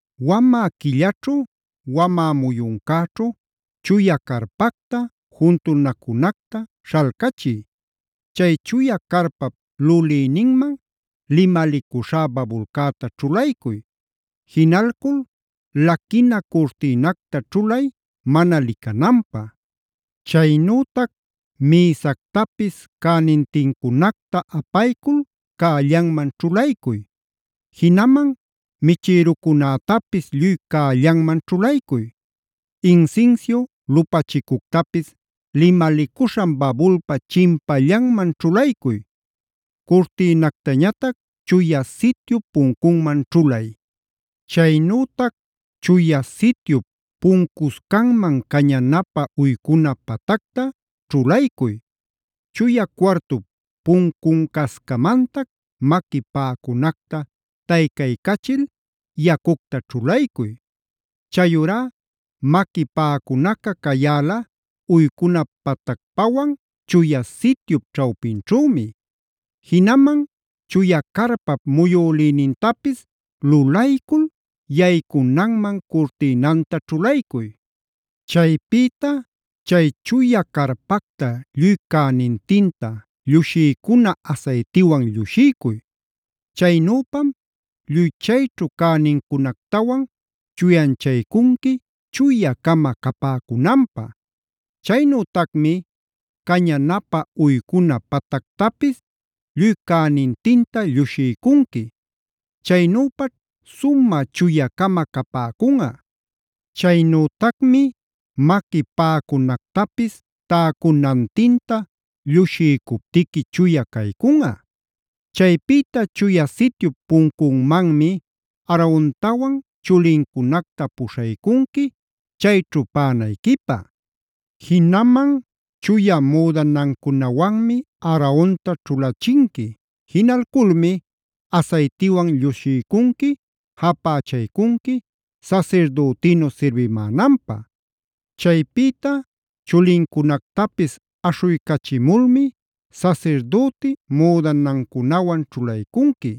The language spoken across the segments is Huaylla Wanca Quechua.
“Wamä quillaćhu, wamä muyuncäćhu chuya carpacta, juntunacunacta śhalcachiy. Chay chuya carpap lulïninman limalicuśhá babulcäta ćhulaycuy. Jinalcul laquina curtïnacta ćhulay mana licananpä. Chaynütac mïsactapis cänintincunacta apaycul cällanman ćhulaycuy. Jinaman michïrucunätapis lluy cällanman ćhulaycuy. Insinsiu lupachicuctapis limalicuśhan babulpa chimpallanman ćhulaycuy. Curtïnactañatac Chuya Sityup puncunman ćhulay. Chaynütac Chuya Sityup puncuscanman cañanapä uycuna patacta ćhulaycuy. Chuya cuartup puncuncascamantac maqui paꞌacunacta taycaycachil yacucta ćhulaycuy. Chayurá maqui paꞌacunaca cayäla uycuna patacpawan Chuya Sityup ćhawpinćhümi. Jinaman chuya carpap muyülïnintapis lulaycul yaycunanman curtïnanta ćhulaycuy. “Chaypïta chay chuya carpacta lluy cänintinta llushiycuna asaytiwan llushiycuy. Chaynüpam lluy chayćhu cänincunactawan chuyanchaycunqui chuya-cama capäcunanpä. Chaynütacmi cañanapä uycuna patactapis lluy cänintinta llushiycunqui. Chaynüpaćh sumä chuya-cama capäcunꞌa. Chaynütacmi maqui paꞌacunactapis täcunantinta llushiycuptiqui chuya caycunꞌa. “Chaypïta Chuya Sityup puncunmanmi Aarontawan chulincunacta puśhaycunqui, chayćhu paꞌanayquipä. Jinaman chuya müdanancunawanmi Aaronta ćhulachinqui. Jinalculmi asaytiwan llushiycunqui, japächaycunqui sasirdütinu sirbimänanpä. Chaypïta chulincunactapis aśhuycachimulmi sasirdüti müdanancunawan ćhulaycunqui.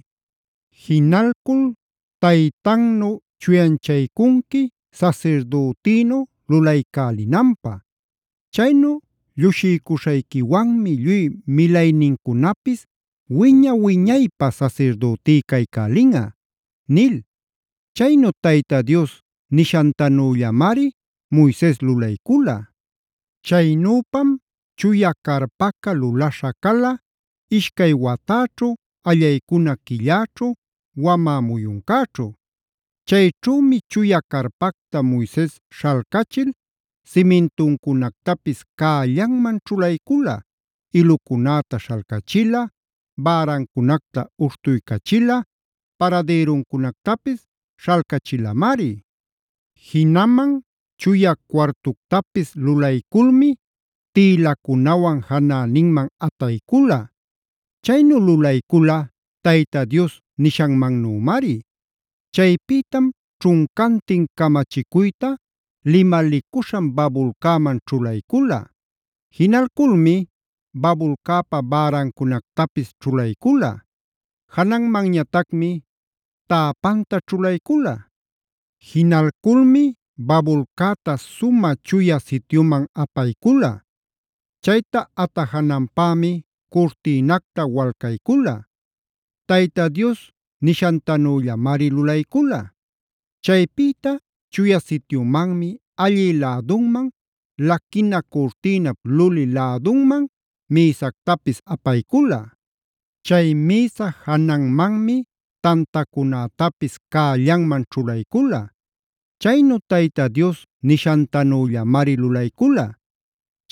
Jinalcul taytantanu chuyanchaycunqui sasirdütïnu lulaycälinanpä. Chaynu llushiycuśhayquiwanmi lluy milaynincunapis wiña-wiñaypä sasirdütí caycälinꞌa” nil. Chaynu Tayta Dios nishantanüllamari Moises lulaycula. Chaynüpam chuya carpaca lulaśha cala, ishcay watäćhu, allaycuna quilläćhu, wamä muyuncäćhu. Chayćhümi chuya carpacta Moises śhalcachil simintuncunactapis cällanman ćhulaycula: ilucunäta śhalcachila, bärancunacta uśhtuycachila, paradïruncunactapis śhalcachilamari. Jinaman chuya cuartuctapis lulayculmi tïlacunawan janäninman ataycula. Chaynu lulaycula Tayta Dios nishanmannümari. Chaypïtam ćhuncantin camachicuyta limalicuśhan babulcäman ćhulaycula. Jinalculmi babulcäpa bärancunactapis ćhulaycula. Jananmanñatacmi täpanta ćhulaycula. Jinalculmi babulcäta sumä Chuya Sityuman apaycula. Chayta atajananpämi curtïnacta walcaycula. Tayta Dios nishantanüllamari lulaycula. Chaypïta Chuya Sityumanmi allï lädunman, laquina curtïnap luli lädunman mïsactapis apaycula. Chay mïsa jananmanmi tantacunätapis cällanman ćhulaycula. Chaynu Tayta Dios nishantanüllamari lulaycula.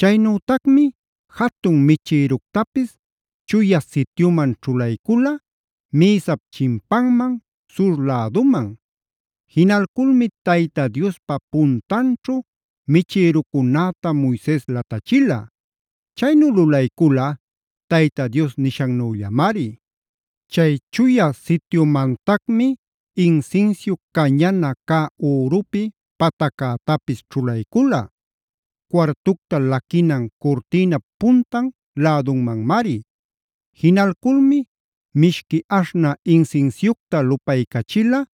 Chaynütacmi jatun michïructapis Chuya Sityuman ćhulaycula, mïsap chimpanman, sur läduman. Jinalculmi Tayta Diospa puntanćhu michïrucunäta Moises latachila. Chaynu lulaycula Tayta Dios nishannüllamari. Chay Chuya Sityumantacmi insinsiu cañana cä ürupi pataccätapis ćhulaycula; cuartucta laquinan curtïnap puntan lädunmanmari. Jinalculmi mishqui aśhnä insinsiucta lupaycachila,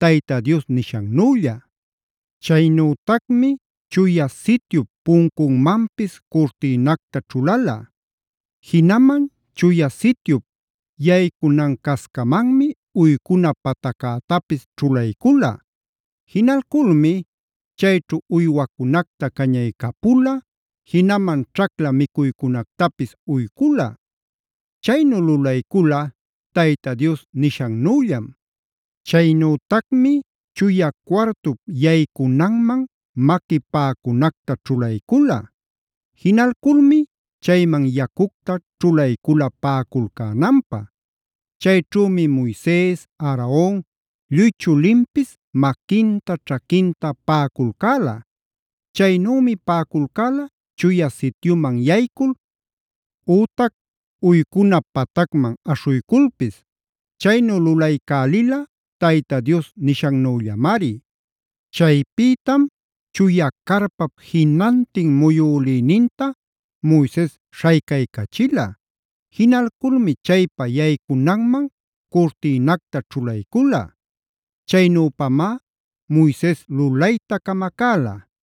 Tayta Dios nishannülla. Chaynütacmi Chuya Sityup puncunmanpis curtïnacta ćhulala. Jinaman Chuya Sityup yaycunan-cascamanmi uycuna pataccätapis ćhulaycula. Jinalculmi chayćhu uywacunacta cañaycapula, jinaman ćhacla micuycunactapis uycula. Chaynu lulaycula Tayta Dios nishannüllam. Chaynütacmi chuya cuartup yaycunanman maqui paꞌacunacta ćhulaycula. Jinalculmi chayman yacucta ćhulaycula paꞌaculcänanpä. Chayćhümi Moises, Aaron, lluy chulinpis maquinta, ćhaquinta paꞌaculcäla. Chaynümi paꞌaculcäla Chuya Sityuman yaycul ütac uycuna patacman aśhuyculpis. Chaynu lulaycälila Tayta Dios nishannüllamari. Chaypïtam chuya carpap jinantin muyülïninta Moises śhaycaycachila. Jinalculmi chaypa yaycunanman curtïnacta ćhulaycula. Chaynüpamá Moises lulayta camacäla.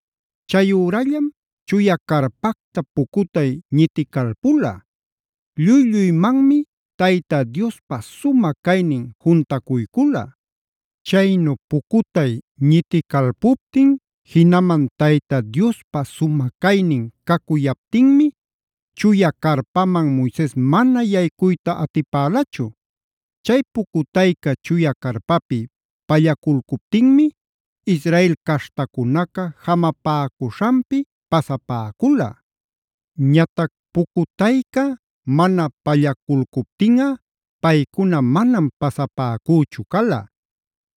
Chayürallam chuya carpacta pucutay ñiticalpula; lluy-lluymanmi Tayta Diospa sumä caynina juntacuycula. Chaynu pucutay ñiticalpuptin, jinaman Tayta Diospa sumä caynin cacuyaptinmi chuya carpaman Moises mana yaycuyta atipälachu. Chay pucutayca chuya carpapi pallaculcuptinmi Israel caśhtacunaca jamapäcuśhanpi pasapäcula. Ñatac pucutayca mana pallaculcuptinꞌa paycuna manam pasapäcüchu cala.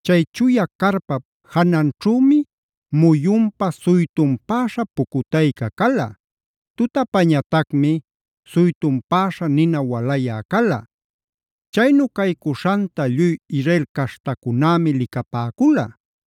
Chay chuya carpap jananćhümi muyunpa suytunpäśha pucutayca cala, tutapañatacmi suytunpäśha nina walayä cala. Chaynu caycuśhanta lluy Israel caśhtacunämi licapäcula.